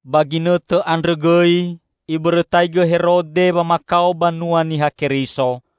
Ba ginõtõ andrõ gõi ibõrõtaigõ Herode wamakao banua Niha Keriso.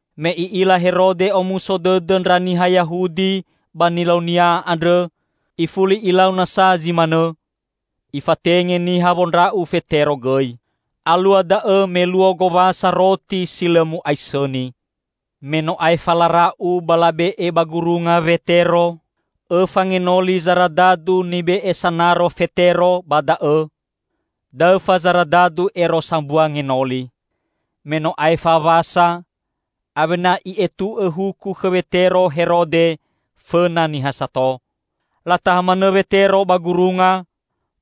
Me i'ila Herode omuso dõdõ ndra niha Yahudi ba nilaunia andrõ, ifuli ilau nasa zi manõ; ifatenge niha wondra'u Fetero gõi. Alua da'õ me luo Gowasa Roti Si Lõ Mu'aisõni. Me no aefa lara'u ba labe'e ba gurunga Wetero, õfa ngenoli zaradadu nibe'e sanaro Fetero ba da'õ -- daõfa zaradadu ero sambua ngenoli. Me no aefa Wasa, awena i'etu'õ huku khõ Wetero Herode fõna niha sato. Lataha manõ Wetero ba gurunga;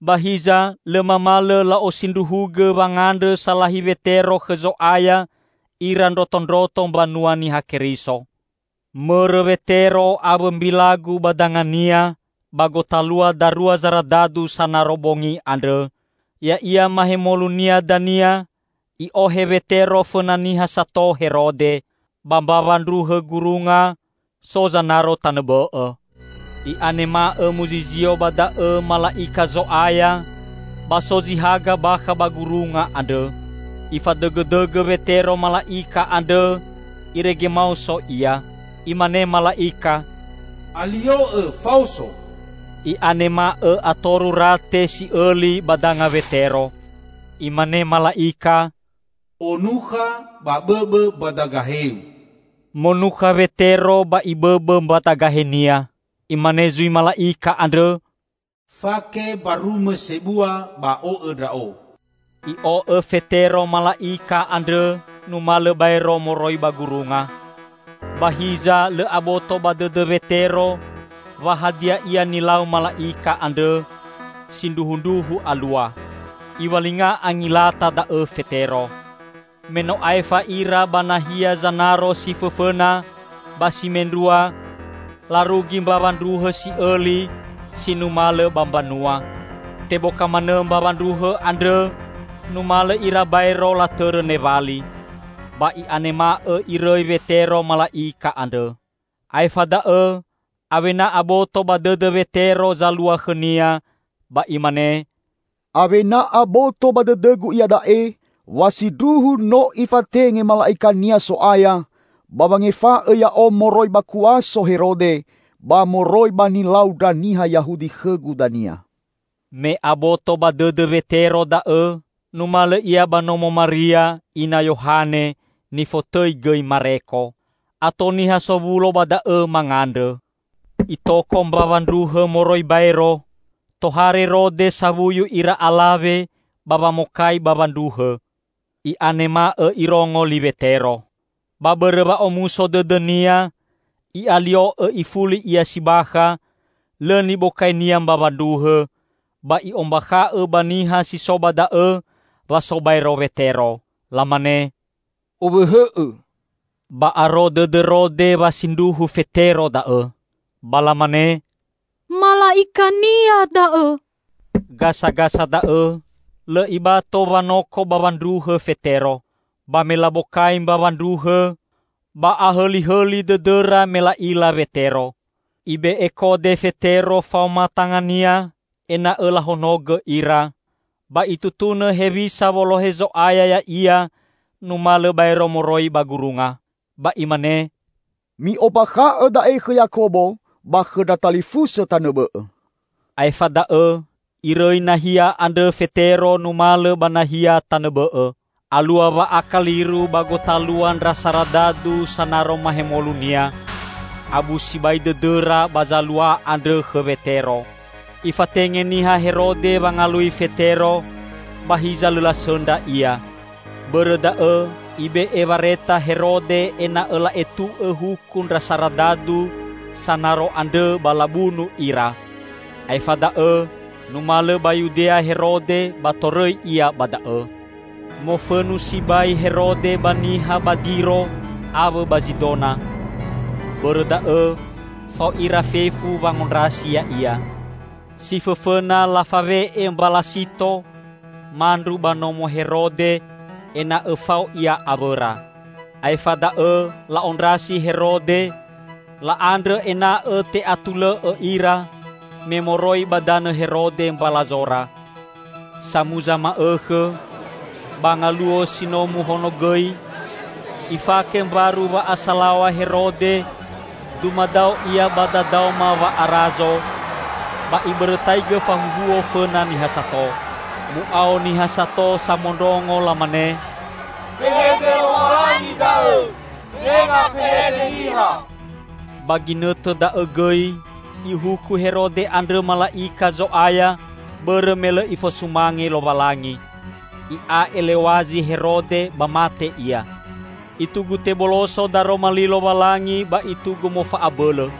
ba hiza lõ mamalõ la'osindruhugõ wangandrõ salahi Wetero khõ Zo'aya ira ndrotondroto Mbanua Niha Keriso. Mõrõ Wetero awõ mbilagu ba dangania ba gotalua darua zaradadu sanaro bongi andrõ, ya'ia mahemolunia dania i'ohe Wetero fõna niha sato Herode. Ba mbawa ndruhõ gurunga, so zanaro tanõ bõ'õ. I'anema'õ muzizio ba da'õ mala'ika Zo'aya ba so zi haga bakha ba gurunga andrõ. Ifadõgõdõgõ Wetero mala'ika andrõ irege maoso ia. Imane mala'ika, "Alio'õ faoso!" I'anema'õ atoru rate si'õli ba danga Wetero. Imane mala'ika, "Onukha ba bõbõ mbadagaheu." Monukha Wetero ba ibõbõ mbadagahenia. Imane zui mala'ika andrõ, "Fake mbarumõ sebua ba o'õ ndra'o." I'o'õ Fetero mala'ika andrõ numalõ baero moroi ba gurunga. Ba hiza lõ aboto ba dõdõ Wetero wa hadia ia nilau mala'ika andrõ, sindruhundruhu alua. Iwalinga angilata da'õ Fetero. Me no aefa ira ba nahia zanaro si fõfõna ba si mendrua, larugi mbawa ndruhõ si'õli, si numalõ ba mbanua. Teboka manõ mbawa ndruhõ andrõ, numalõ ira baero latõrõ newali. Ba i'anema'õ irõi Wetero mala'ika andrõ. Aefa da'õ awena aboto ba dõdõ Wetero zalua khõnia, ba imane, "Awena aboto ba dõdõgu iada'e wa sindruhu no ifatenge mala'ika-Nia So'aya ba wangefa'õ ya'o moroi ba kuaso Herode ba moroi ba nilau ndra niha Yahudi khõgu dania." Me aboto ba dõdõ Wetero da'õ, numalõ ia ba nomo Maria, ina Yohane nifotõi gõi Mareko. Ato niha sowulo ba da'õ mangandrõ. Itoko mbawa ndruhõ moroi baero, tohare Rode sawuyu ira alawe ba wamokai bawa ndruhõ. I'anema'õ irongo li Wetero. Ba bõrõ wa'omuso dõdõnia, i'alio'õ ifuli ia si bakha, lõ nibokainia mbawa ndruhõ, ba i'ombakha'õ ba niha si so ba da'õ wa so baero Wetero. Lamane, "Owõhõ'õ!" Ba aro dõdõ Rode wa sindruhu Fetero da'õ. Ba lamane, "Mala'ikania da'õ!" Gasagasa da'õ lõ ibato wanoko bawa ndruhõ Fetero. Ba me labokai mbawa ndruhõ, ba ahõlihõli dõdõra me la'ila Wetero. Ibe'e kode Fetero faoma tangania ena'õ lahonogõ ira, ba itutunõ hewisa wolohe Zo'aya ya'ia numalõ baero moroi ba gurunga. Ba imane, "Mi'ombakha'õ da'e khõ Yakobo ba khõ ndra talifusõ tanõ bõ'õ." Aefa da'õ irõi nahia andrõ Fetero numalõ ba nahia tanõ bõ'õ. Alua wa'akaliru ba gotalua ndra saradadu sanaro mahemolunia. Abu sibai dõdõra ba zalua andrõ khõ Wetero. Ifatenge niha Herode wangalui Fetero, ba hiza lõ lasõndra ia. Bõrõ da'õ ibe'e wareta Herode ena'õ la'etu'õ huku ndra saradadu sanaro andrõ ba labunu ira. Aefa da'õ numalõ ba Yudea Herode ba torõi ia ba da'õ. Mofõnu sibai Herode ba niha ba Diro awõ ba Zidona. Bõrõ da'õ fao ira fefu wangondrasi ya'ia. Si fõfõna lafawe'e Mbalasito, mandru ba nomo Herode ena'õ fao ia awõra. Aefa da'õ la'ondrasi Herode, la'andrõ ena'õ te'atulõ'õ ira, me moroi ba danõ Herode mbalazora. Samuza ma'õkhõ ba ngaluo si no muhonogõi, ifake mbaru wa'asalaw̃a Herode dumadao ia ba dadaoma wa'arazo, ba ibõrõtaigõ fahuhuo fõna niha sato. Mu'ao niha sato samondrongo lamane, "Fehede lowalangi da'õ, tenga fehede niha!" Ba ginõtõ da'õ gõi ihuku Herode andrõ mala'ika Zo'aya bõrõ me lõ ifosumange Lowalangi. I'a elew̃azi Herode ba mate ia. Itugu teboloso Daroma Li Lowalangi ba itugu mofa'abõlõ.